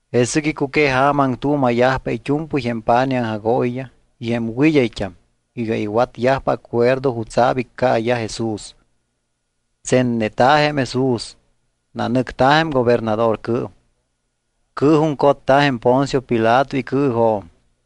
Jesɨc icuqueja̱ma aŋtuuma̱yajpa it́u̱mpɨy jém pa̱nij aŋjagooyiyaj y jém wɨd́ayt́am iga iwatyajpa acuerdo jutsa̱p iccaayaj Jesús. Tsenneta̱ jém Jesús, nanɨcta̱ jém gobernadorcɨɨm. Cɨɨjuŋcotta̱ jém Poncio Pilato icɨɨjo̱m.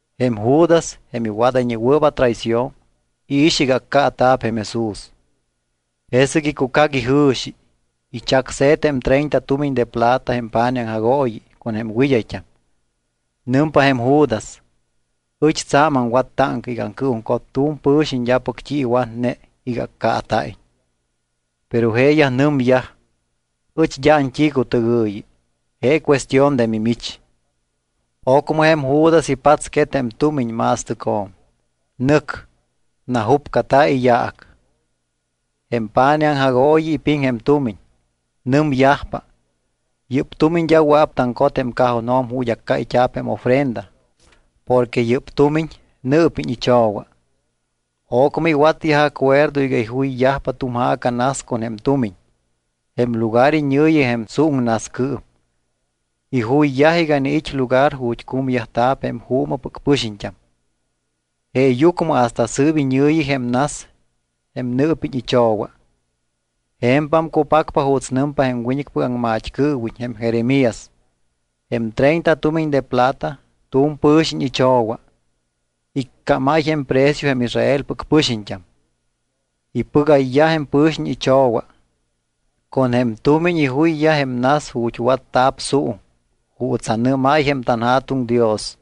Jém Judas, jém iwadayñewɨɨp atraición, iix iga accaata̱p jém Jesús. Jesɨc icucac ijɨ̱xi, ichacse̱t jém treinta tumiñ de plata jém pa̱nij aŋjagooyi con jém wɨd́ayt́am. Nɨmpa jém Judas: —Ɨch tsa̱m aŋwat táŋca iga aŋcɨɨjuŋcot tu̱m pɨ̱xiñ d́apɨc t́i iwatne iga accaata̱iñ. Pero jeeyaj nɨmyaj: —Ɨch d́a ant́icutɨgɨ̱yi. Je cuestión de mimich. Ocmɨ jém Judas ipatsquet jém tumiñ ma̱stɨcjo̱m. Nɨc. Najúpcata̱ iyaac. Jém pa̱nij aŋjagooyi ipiŋ jém tumiñ. Nɨmyajpa, yɨ́p tumiñ d́a wɨa̱p taŋcot jém cajonjo̱m ju̱t́ accáyt́a̱p jém ofrenda porque yɨ́p tumiñ nɨɨpiñ icho̱wa. Ocmɨ iwatyaj acuerdo iga ijuyyajpa tu̱m ja̱ca nas con jém tumiñ. Jém lugar iñɨ̱yi jém suuŋnascɨɨm. Ijuyyaj iga iniit́ lugar ju̱t́ cumyajta̱p jém juumɨpɨc pɨxiñt́am. Jeeyucmɨ hasta sɨɨp iñɨ̱yi jém nas, jém Nɨɨpiñ iCho̱wa. Je̱mpam cupacpa juuts nɨmpa jém wiñɨcpɨc aŋmat́cɨɨwiñ jém Jeremías: “Jém treinta tumiñ de plata tu̱m pɨ̱xiñ icho̱wa. Iccámáy jém precio jém Israelpɨc pɨxiñt́am. Ipɨgayyaj jém pɨ̱xiñ icho̱wa. Con jém tumiñ ijuyyaj jém nas ju̱t́ watta̱p suuŋ juuts anɨ́máy jém tanJa̱tuŋ Dios.”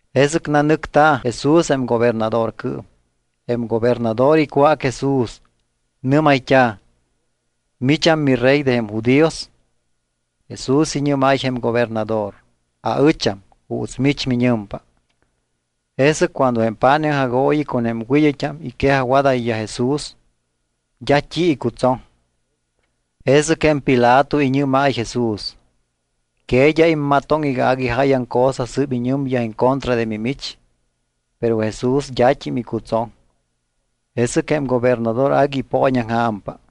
Jesɨc nanɨcta̱ Jesús jém gobernadorcɨɨm. Jém gobernador icwác Jesús. Nɨ́mayt́a̱: —¿Micham miRey de jém judíos? Jesús iñɨ́máy jém gobernador: —Aɨcham, juuts mich miñɨmpa. Jesɨc cuando jém pa̱nij aŋjagooyi con jém wɨd́ayt́am iquejajwadáy Jesús, d́a t́i icutsoŋ. Jesɨc jém Pilato iñɨ́máy Jesús: —¿Que d́a immatoŋ iga agui jáyaŋ cosa sɨ́p iñɨmyaj en contra de mimich? Pero Jesús d́at́im icutsoŋ. Jesɨc jém gobernador agui ipooñaŋja̱mpa.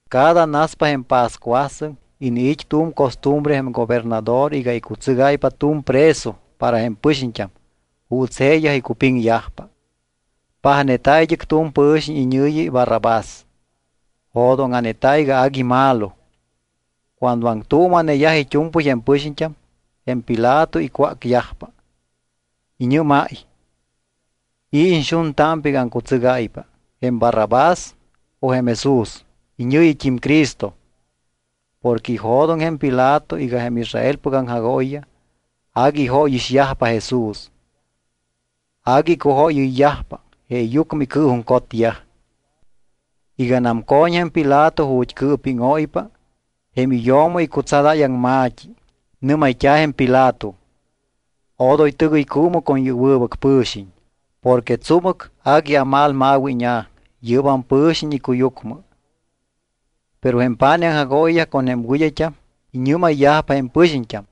Cada naspa jém pascuasɨŋ, iniit́ tu̱m costumbre jém gobernador iga icutsɨgáypa tu̱m preso para jém pɨxiñt́am juuts jeeyaj icupiŋyajpa. Pajneta̱ id́ɨc tu̱m pɨ̱xiñ iñɨ̱yi Barrabás. Jo̱dóŋa̱neta̱ iga agui malo. Cuando aŋtuuma̱neyaj it́u̱mpɨy jém pɨxiñt́am, jém Pilato icwácyajpa. Iñɨ́máy: —¿I̱ iñxuntámpa iga aŋcutsɨgáypa, jém Barrabás o jém Jesús, iñɨ̱yit́im Cristo? Porque ijo̱doŋ jém Pilato iga jém Israelpɨc aŋjagooyiyaj agui ijóyixyajpa Jesús, agui icujóyɨyyajpa jeeyucmɨ icɨɨjuŋcotyaj. Iganam co̱ñ jém Pilato ju̱t́ cɨɨpíŋóypa, jém iyo̱mo icutsadáy aŋma̱t́i. Nɨ́mayt́a̱ jém Pilato: “Odoy tɨgɨycuumɨ con yɨ́p wɨbɨc pɨ̱xiñ. Porque tsúmɨc agui amalmawíña̱ yɨ́bam pɨ̱xiñ icuyucmɨ.” Pero jém pa̱nij aŋjagooyiyaj con jém wɨd́ayt́am iñɨ́mayyajpa jém pɨxiñt́am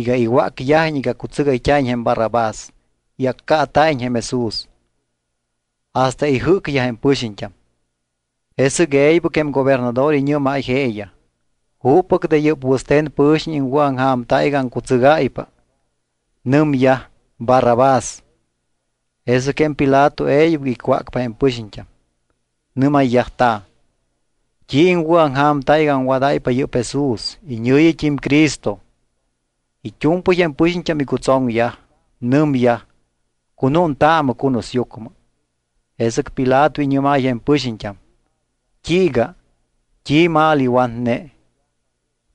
iga iwácyajiñ iga cutsɨgayt́a̱iñ jém Barrabás y accaata̱iñ jém Jesús, hasta ijɨ́cyaj jém pɨxiñt́am. Jesɨc e̱ybɨc jém gobernador iñɨ́máy jeeyaj: —¿Juppɨc de yɨ́p wɨste̱n pɨ̱xiñ iŋwɨ̱aŋja̱mta iga aŋcutsɨgáypa? Nɨmyaj: —Barrabás. Jesɨc jém Pilato e̱ybɨc icwácpa jém pɨxiñt́am. Nɨ́mayyajta̱: —¿T́i iŋwɨ̱aŋja̱mta iga aŋwadáypa yɨ́p Jesús iñɨ̱yit́im Cristo? It́u̱mpɨy jém pɨxiñt́am icutsoŋyaj. Nɨmyaj: —¡Cunúntaamɨ cunusyucmɨ! Jesɨc Pilato iñɨ́máy jém pɨxiñt́am: —¿T́iiga? ¿T́i mal iwatne?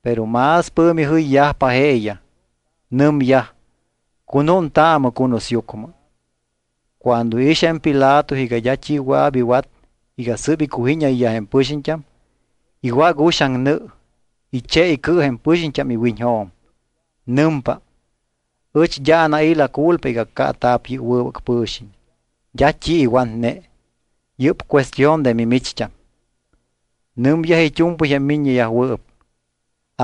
Pero más pɨ̱mi jɨyyajpa jeeyaj. Nɨmyaj: —¡Cunúntaamɨ cunusyucmɨ! Cuando iix jém Pilato iga d́a t́i wɨa̱p iwat iga sɨ́p icujíñayyaj jém pɨxiñt́am, iwác uxaŋ nɨ, iche icɨ jém pɨxiñt́am iwiñjo̱m. Nɨmpa: —Ɨch d́a anai̱ la culpa iga accaata̱p yɨ́p wɨbɨc pɨ̱xiñ. D́a t́i iwatne. Yɨ́p cuestión de mimicht́am. Nɨmyaj it́u̱mpɨy jém miññeyajwɨɨp: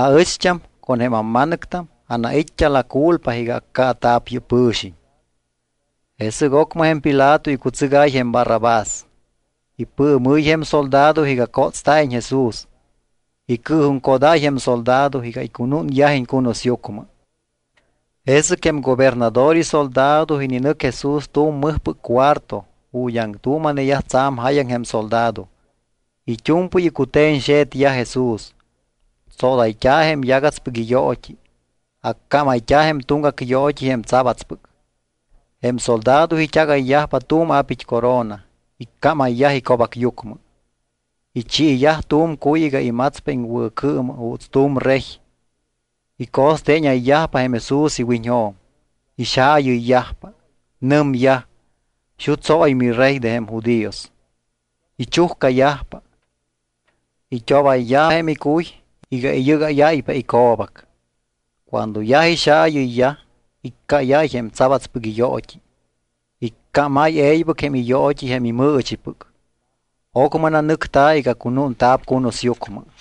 —Aɨcht́am con jém amma̱nɨctam anait́t́a la culpa iga accaata̱p yɨ́p pɨ̱xiñ. Jesɨc ocmɨ jém Pilato icutsɨgáy jém Barrabás. Ipɨɨmɨ́y jém soldado iga cótsta̱iñ Jesús. Icɨɨjuŋcodáy jém soldado iga icunúnyajiñ cunusyucmɨ. Jesɨc jém gobernador isoldado ininɨc Jesús tu̱m mɨjpɨc cuarto ju̱t́ aŋtuuma̱neyaj tsa̱m jáyaŋ jém soldado. It́u̱mpɨy icute̱ñxe̱tyaj Jesús. Tsodayt́a̱ jém yagatspɨc iyoot́i. Accámayt́a̱ jém tuŋgac yoot́i jém tsabatspɨc. Jém soldado it́agayyaj tu̱m apit́ corona, icámayyaj ico̱bacyucmɨ. Ichiiyaj tu̱m cuy iga imatspa iŋwɨ̱cɨɨmɨ juuts tu̱m rey. Ico̱steeñayyajpa jém Jesús iwiñjo̱m. Ixaayɨyyajpa. Nɨmyaj: —¡Xutsóy miRey de jém judíos! Ichujcayajpa. It́obayyaj jém icuy iga iyɨ́gáyáypa ico̱bac. Cuando yaj ixaayɨyyaj, iccáyáy jém tsabats yoot́i, icámáy e̱ybɨc jém iyoot́i jém imɨɨchipɨc. Ocmɨ nanɨcta̱ iga cunúnta̱p cunusyucmɨ.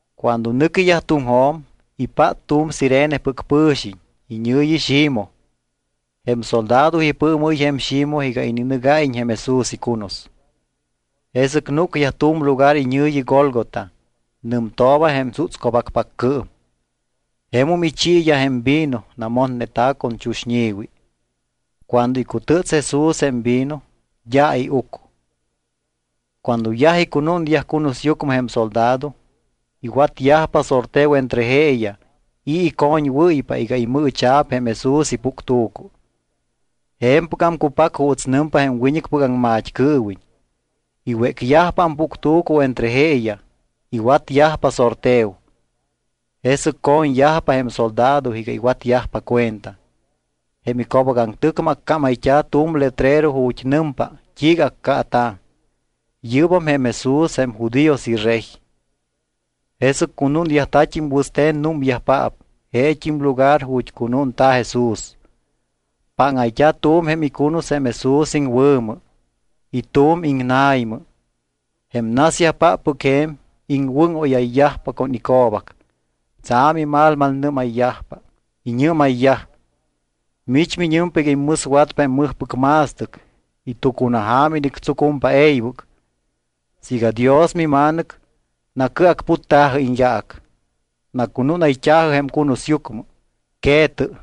Cuando nɨquiyaj tuŋjo̱m, ipát tu̱m Cirenepɨc pɨ̱xiñ iñɨ̱yi Ximoj. Jém soldado ipɨɨmɨ́y jém Ximoj iga ininɨgáyiñ jém Jesús icunus. Jesɨc núcyaj tu̱m lugar iñɨ̱yi Gólgota. Nɨmtooba jém Tsútsco̱bacpaccɨɨm. Jemum ichiiyaj jém vino namotneta̱ con chuxñi̱wi. Cuando icutɨ́ts Jesús jém vino, d́a iuc. Cuando yaj icunúnyaj cunusyucmɨ jém soldado, iwatyajpa sorteo entre jeeyaj i̱ icoñwɨ́ypa iga imɨɨcha̱p jém Jesús ipuctu̱cu. Je̱mpɨgam cupac juuts nɨmpa jém wiñɨcpɨc aŋmat́cɨɨwiñ: “Iwécyajpa ampuctu̱cu entre jeeyaj. Iwatyajpa sorteo.” Jesɨc co̱ñyajpa jém soldado iga iwatyajpa cuenta. Jém ico̱bacaŋtɨcmɨ accámayt́a̱ tu̱m letrero ju̱t́ nɨmpa t́iiga accaata̱: “Yɨ́bam jém Jesús jém judíos iRey.” Jesɨc cunúnyajta̱t́im wɨste̱n númyajpaap jeet́im lugar ju̱t́ cunúnta̱ Jesús. Páŋayt́a̱ tu̱m jém icunus jém Jesús iŋwɨ̱mɨ y tu̱m iŋna̱ymɨ. Jém nasyajpáppɨc je̱m iŋwɨ́ŋóyayyajpa con ico̱bac, tsa̱m imalmalnɨ́mayyajpa. Iñɨ́mayyaj: —Mich miñɨmpa iga immɨswatpa jém mɨjpɨc ma̱stɨc y tucunaja̱ma inictsucumpa e̱ybɨc. Siiga Dios miMa̱nɨc, nacɨacputta̱jɨ iñyaac. Nacunúnayt́a̱jɨ jém cunusyucmɨ, que̱tɨ.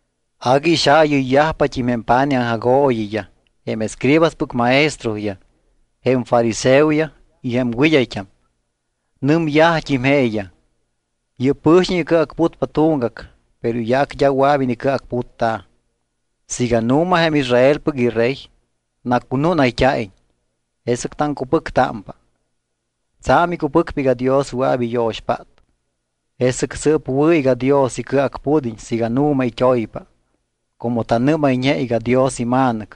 Agui ixaayɨyyajpat́im jém pa̱nij aŋjagooyiyaj, jém escribaspɨc maestroyaj, jém fariseoyaj y jém wɨd́ayt́am. Nɨmyajt́im jeeyaj: —Yɨ́p pɨ̱xiñ icɨacputpa tuŋgac, pero iyaac d́a wɨa̱p inicɨacputta̱. Siiga nu̱ma jém Israelpɨc iRey, nacunúnayt́a̱iñ, jesɨc taŋcupɨctámpa. Tsa̱m icupɨcpa iga Dios wɨa̱p iyo̱xpát, jesɨc sɨɨp wɨ̱ iga Dios icɨacpud́iñ siiga nu̱ma it́oypa; como tanɨ́mayñe iga Dios iMa̱nɨc.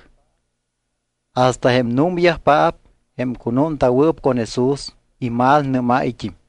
Hasta jém númyajpaap, jém cunúnta̱wɨɨp con Jesús, imalnɨ́máyt́im.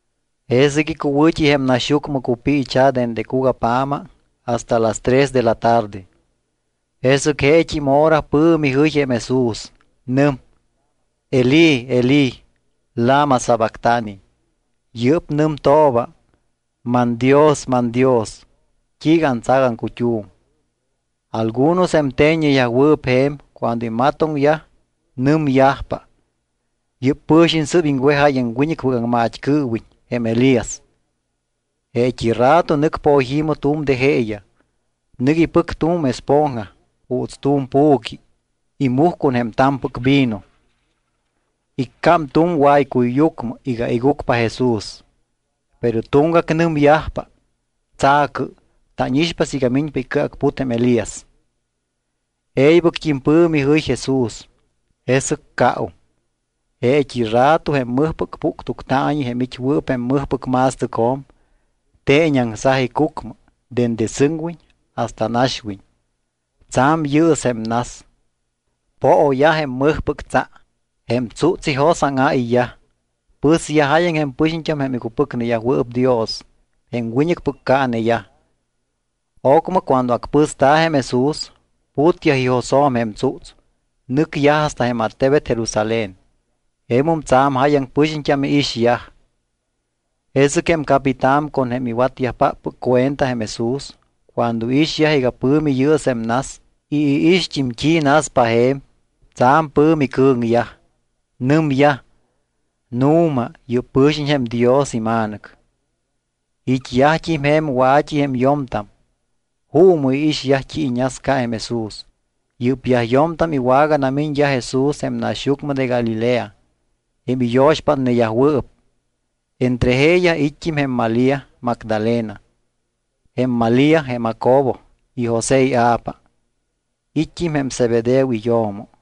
Jesɨc icuwɨ̱t́i jém naxyucmɨ cupiicha̱ dende cugapja̱ma hasta las tres de la tarde. Jesɨc jeet́im hora pɨ̱mi jɨy jém Jesús. Nɨm: —Elí Elí, ¿lama sabactani? Yɨ́p nɨmtooba: ManDios, manDios, ¿t́iiga antsac aŋcut́um? Algunos jém te̱ññeyajwɨɨp je̱m cuando imatoŋyaj, nɨmyajpa: —Yɨ́p pɨ̱xiñ sɨ́p iŋwejáy jém wiñɨcpɨc aŋmat́cɨɨwiñ jém Elías. Jeet́i rato nɨc poyi̱mɨ tu̱m de jeeyaj. Nɨc ipɨc tu̱m esponja juuts tu̱m pu̱qui. Imuj con jém ta̱mpɨc vino. Iccám tu̱m waycuyyucmɨ iga igucpa Jesús. Pero tuŋgac nɨmyajpa: —Tsa̱cɨ, tánixpa siiga miñpa icɨacput jém Elías. E̱ybɨct́im pɨ̱mi jɨy Jesús, jesɨc caum. Jeet́i rato jém mɨjpɨc puctuctaañi jém it́wɨɨp jém mɨjpɨc ma̱stɨcjo̱m teeñaŋsaj icucmɨ dende sɨŋwiñ hasta naxwiñ. Tsa̱m yɨɨs jém nas, pooyaj jém mɨjpɨc tsa. Jém tsúts ijos áŋáyyaj. Pɨsyaj jáyaŋ jém pɨxiñt́am jém icupɨcneyajwɨɨp Dios, jém wiñɨcpɨc caaneyaj. Ocmɨ cuando acpɨsta̱ jém Jesús, putyaj ijosjo̱m jém tsúts, nɨcyaj hasta jém attebet Jerusalén. Jemum tsa̱m jáyaŋ pɨxiñt́am iixyaj. Jesɨc jém capitán con jém iwatyajpáppɨc cuenta jém Jesús, cuando iixyaj iga pɨ̱mi yɨɨs jém nas y iixt́im t́i naspa je̱m, tsa̱m pɨ̱mi cɨ̱ŋyaj. Nɨmyaj: —Nu̱ma, yɨ́p pɨ̱xiñ jém Dios iMa̱nɨc. It́yajt́im je̱m wa̱t́i jém yo̱mtam, juumɨ iixyajpa t́i iñasca jém Jesús. Yɨ́pyaj yo̱mtam iwaganamiñyaj Jesús jém naxyucmɨ de Galilea, jém iyo̱xpátneyajwɨɨp. Entre jeeyaj it́t́im jém Malía Magdalena, jém Malía jém Jacobo y José ia̱pa, it́t́im jém Zebedeo iyo̱mo.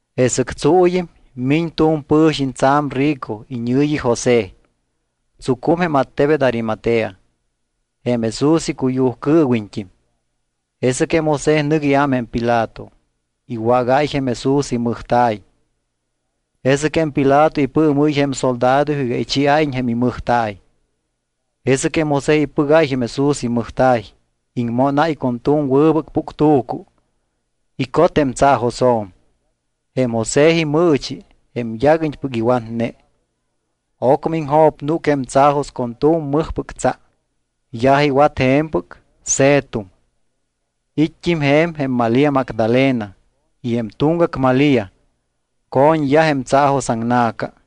Jesɨc tsuuyɨm miñ tu̱m pɨ̱xiñ tsa̱m rico iñɨ̱yi José. Tsucum jém attebet Arimatea, jém Jesús icuyujcɨɨwiñt́im. Jesɨc jém José nɨc iám jém Pilato, iwágáy jém Jesús imɨjta̱y. Jesɨc jém Pilato ipɨɨmɨ́y jém soldado iga ichiáyiñ jém imɨjta̱y. Jesɨc José ipɨgáy jém Jesús imɨjta̱y, iŋmónáy con tu̱m wɨbɨc puctu̱cu. Icot jém tsaajosjo̱m, jém José imɨɨchi, jém yaguiñpɨc iwatne. Ocmɨ iŋjo̱pnúc jém tsaajos con tu̱m mɨjpɨc tsa. Yaj iwat je̱mpɨc, se̱tum. It́t́im je̱m jém Malía Magdalena y jém tuŋgac Malía. Co̱ñyaj jém tsaajosaŋna̱ca.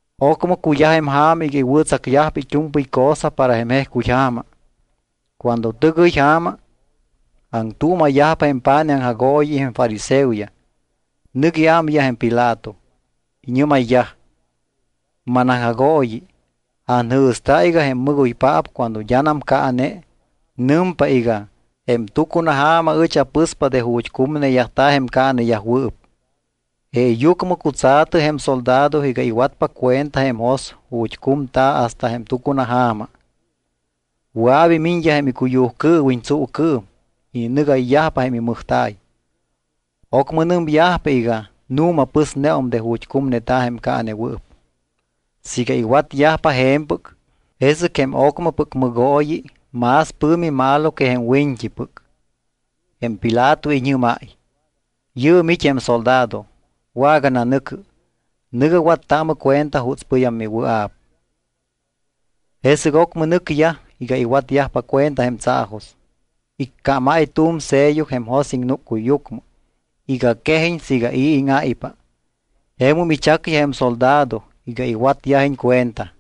Ocmɨ cuyaj jém ja̱ma iga iwɨ̱tsacyajpa it́u̱mpɨy cosa para jém jejcuy ja̱ma. Cuando tɨgɨy ja̱ma, aŋtuuma̱yajpa jém pa̱nij aŋjagooyi y jém fariseoyaj, nɨc iámyaj jém Pilato. Iñɨ́mayyaj: —Manaŋjagooyi, anjɨ̱sta iga jém mɨgoypaap cuando d́anam caane, nɨmpa iga: “Jém tucunaja̱ma ɨch apɨspa de ju̱t́ cumneyajta̱ jém caaneyajwɨɨp.” Jeeyucmɨ cutsa̱tɨ jém soldado iga iwatpa cuenta jém jos ju̱t́ cumta̱ hasta jém tucunaja̱ma. Wɨa̱p imiñyaj jém icuyujcɨɨwiñ tsuucɨɨm, ininɨgayyajpa jém imɨjta̱y. Ocmɨ nɨmyajpa iga: “Nu̱ma pɨsneum de ju̱t́ cumneta̱ jém caanewɨɨp.” Siiga iwatyajpa je̱mpɨc, jesɨc jém ocmɨpɨc mɨgooyi más pɨ̱mi malo que jém wiñt́ipɨc. Jém Pilato iñɨ́máy: —Yɨɨm it́ jém soldado. Wagananɨ̱cɨ. Nɨ̱gɨ wattaamɨ cuenta jutspɨyam miwɨa̱p. Jesɨc ocmɨ nɨcyaj iga iwatyajpa cuenta jém tsaajos. Icámáy tu̱m sello jém jos iŋnúccuyyucmɨ iga quejiñ siiga i̱ íŋáypa. Jemum ichacyaj jém soldado iga iwatyajiñ cuenta.